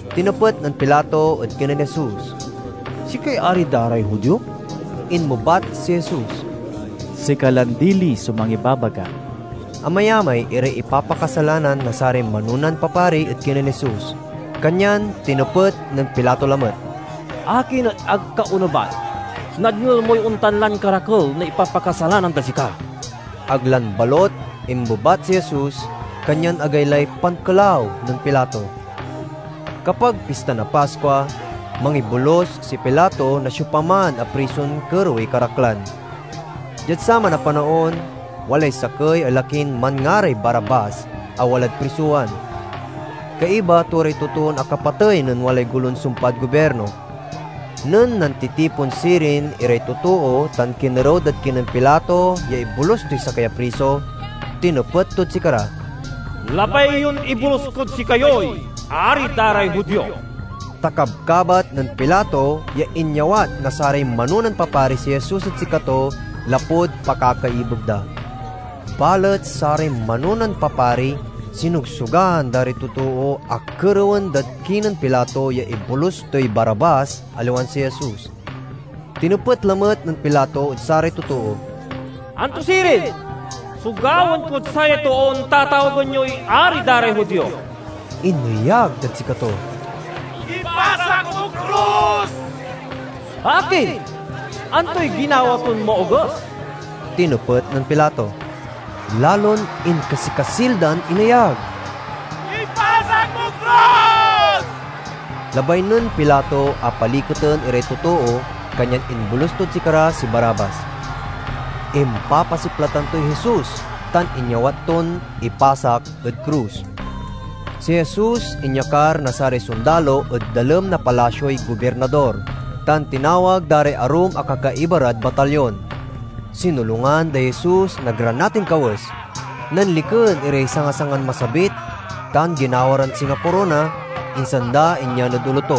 Tinepet nen Pilato ed kinen Jesus, "Sikay ari da ray Judio?" Inmebat si Jesus, "Sika lan dili so mangibabaga." Amayamay iray ipapakasalanan na saray manonan papari ed kinen Jesus, kanyan tinepet nen Pilato lamet, "Akin et ag ka onebat? Nadngel moy ontan lan karakel na ipapakasalanan dad sika!" Ag lan balut inmebat si Jesus, kanyan agaylay pankelaw nen Pilato. Kapag Pista na Paskua, mangibolus si Pilato na siopaman a prison kerewey karaklan. Diad saman a panaon walay sakey a lakin manngaray Barabbas a walad prisowan. Kaiba to ray totoon akapatey nen walay golon sumpad gobirno. Nen nantitipon sirin iray totoo tan kinerew dad kinen Pilato ya ibolus toy sakey a priso, tinepet tod sikara, "Labay yon ibolus kod sikayoy ari da ray Judio?" Ta kabkabat nen Pilato ya inyawat na saray manonan papari si Jesus ed sikato, lapud pakakaibeg da. Balet saray manonan papari sinogsogan da ray totoo a kerewen dad kinen Pilato ya ibolus toy Barabbas, aliwan si Jesus. Tinepet lamet nen Pilato ed saray totoo, "Anto sirin so gawaen kod sayay toon tatawagen yoy ari da ray Judio?" Ineyag dad sikato, "Ipasak mod krus!" "Akin, antoy ginawa ton maoges?" tinepet nen Pilato. Lalon inkasikasil dan ineyag, "Ipasak mod krus!" Labay nen Pilato a paliketen iray totoo, kanyan imbolus tod sikara si Barabbas. Impapasiplatan toy Jesus, tan inyawat ton ipasak ed krus. Si Jesus inyakar na saray sondalo ed dalem na palasioy gobirnador, tan tinawag da ray arum a kakaiba rad batalyon. Sinolungan day Jesus na granatin kawes, nanliken iray sangasangan masabit tan ginawa ran singa korona, insan da inyan ed olo to.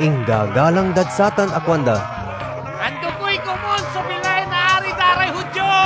Inggagalang dad satan a kuanda, "Andokey komun so bilay na Ari da ray Judio!"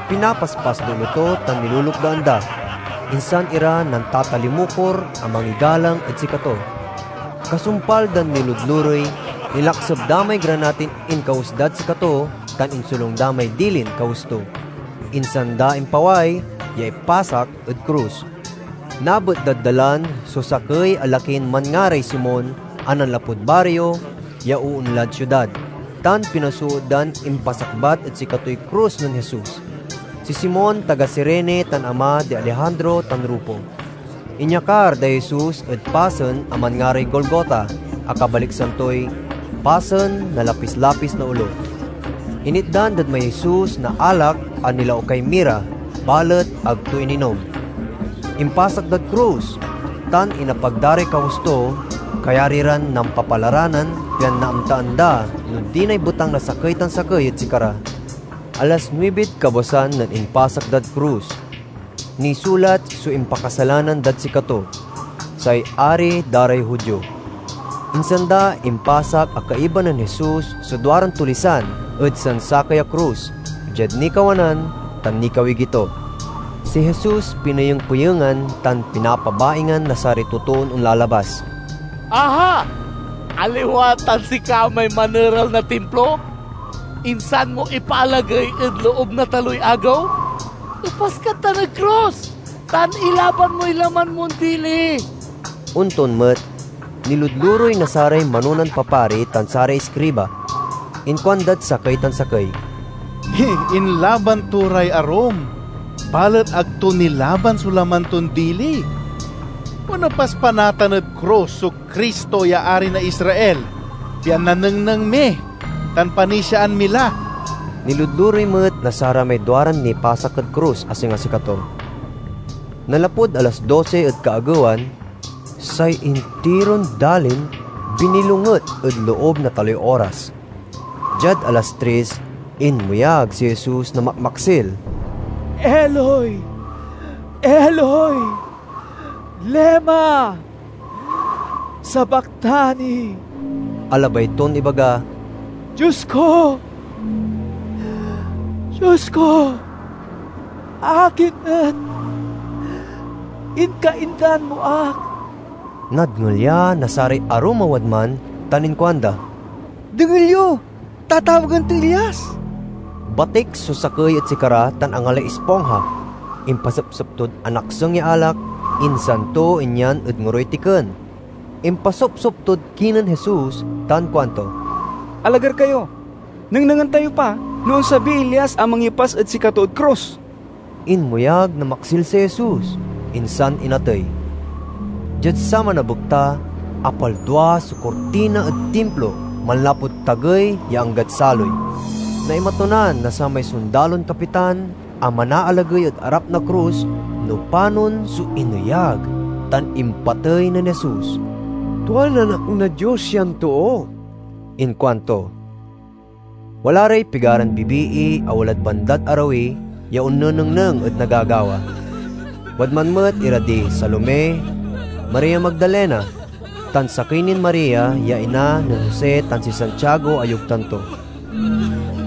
Pinapaspas day olo to tan nilulukdaan da, insan ira nantatalimukor a mangigalang ed sikato. Kasumpal dan niludlurey, nilakseb da may granatin inkawes dad sikato tan insolung da may dilin kawes to. Insan da impaway ya ipasak ed krus. Nabet dad dalan so sakey a lakin manngaray Simon, a nanlapud bario ya oonlad siudad, tan pinasoot dan impasakbat ed sikatoy krus nen Jesus. Si Simon taga Cirene tan ama di Alejandro tan Rufo. Inyakar day Jesus ed pasen a manngaray Golgota a kabaliksan toy "Pasen na Lapis-lapis na Olo." Initdan dad may Jesus na alak a nilaukay mira, balet ag to ininom. Impasak dad krus, tan inapag da ray kawes to kayari ran nampapalaranan, pian naamtaan da no dinay betang na sakey tan sakey ed sikara. Alas nuibid kabwasan nen impasak dad krus. Nisulat so impakasalanan dad sikato: "Say Ari da ray Judio." Insan da impasak a kaiba nen Jesus so duaran tulisan ed sansakey a krus, diad nikawanan tan nikawigi to. Si Jesus pineyeng-peyengan tan pinapabaingan na saray totoon onlalabas: "Aha, aliwa tan sika may maneral na Timplo, insan mo ipaalagey ed loob na taloy agew? Epas kad tan ed krus tan ilaban moy laman mon dili!" Onton met, niludlurey na saray manonan papari tan saray iskriba. Inkuandad sakey tan sakey, "Inlaban to ray arum, balet ag to nilaban so laman ton dili! Onepas pa natan ed krus so Cristo ya ari na Israel, pian nanengneng mi tan panisiaan mi la!" Niludlurey met na saramay duaran nipasak ed krus, a singa sikato. Nanlapud alas dosi ed kaagewan, say intiron dalin binnilonget ed loob na taloy oras. Diad alas tris, inmeyag si Jesus na makmaksil, "Eloi, Eloi, lema sabachthani?" a labay ton ibaga, "Dios ko, Dios ko, akin et inkaindan mo ak?" Nadngel ya na saray arum a wadman tan inkuanda, "Dengel yo, tatawagen toy Elias!" Batik so sakey ed sikara tan angalay ispongha. Impasepsep tod anakseng ya alak, insan to inyan ed ngoroy tiken. Impasopsop tod kinen Jesus tan kuanto, "Alagar kayo! Nengnengen tayo pa no onsabiy Elias a mangyepas ed sikato ed krus!" Inmeyag na maksil si Jesus, insan inatey. Diad saman a bekta, apaldua so kurtina ed Timplo, manlapud tagey ya anggad saloy. Naimatunan na samay sondalon kapitan a manaalagey ed arap na krus no panon so ineyag tan impatey nen Jesus. "Tuan Anak na Dios yan too!" inkuanto. Wala ray pigaran bibii a walad bandad arawi ya onnenengneng ed nagagawa. Wadman met ira di Salome, Maria Magdalena, tan sakey nin Maria ya ina nen Jose tan si Santiago a yogtan to.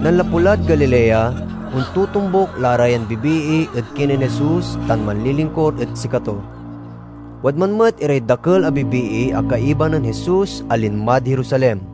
Nanlapu lad Galilea, ontotombuk la ra yan bibii ed kinen Jesus tan manlilingkur irad sikato. Wadman met iray dakel a bibii a kaiba nen Jesus a linmad Jerusalem.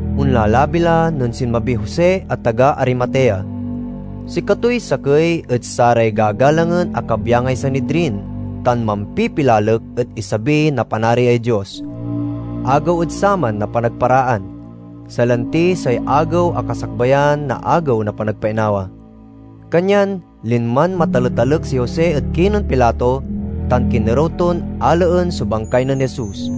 Onlalabi la nen sinmabiy Jose a taga Arimatea. Sikatoy sakey ed saray gagalangen a kabyangay Sanidrin, tan mampipilalek ed isabi na Panariay Dios. Agew ed saman a Panagparaan (salanti say agew a kasakbayan na Agew na Panagpainawa), kanyan linman mataletalek si Jose ed kinen Pilato tan kinerew ton alaen so bangkay nen Jesus.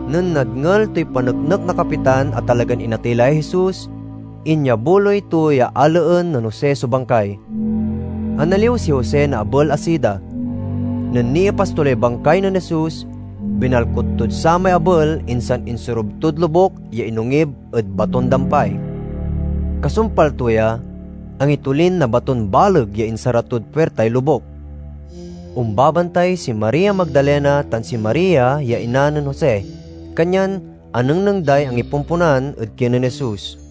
Nen nadngel toy paneknek na kapitan a talagan inatey lay Jesus, inyabuloy to ya alaen nen Jose so bangkay. Analiw si Jose na abel a sida. Nen niepas to lay bangkay nen Jesus, binalkut tod samay abel, insan insorub tod lobuk ya inongib ed baton-dampay. Kasumpal to ya, angitolin na baton baleg ya insara tod puirtay lobuk. Ombabantay si Maria Magdalena tan si Maria ya ina nen Jose, kanyan anengneng day angipomponan ed kinen Jesus.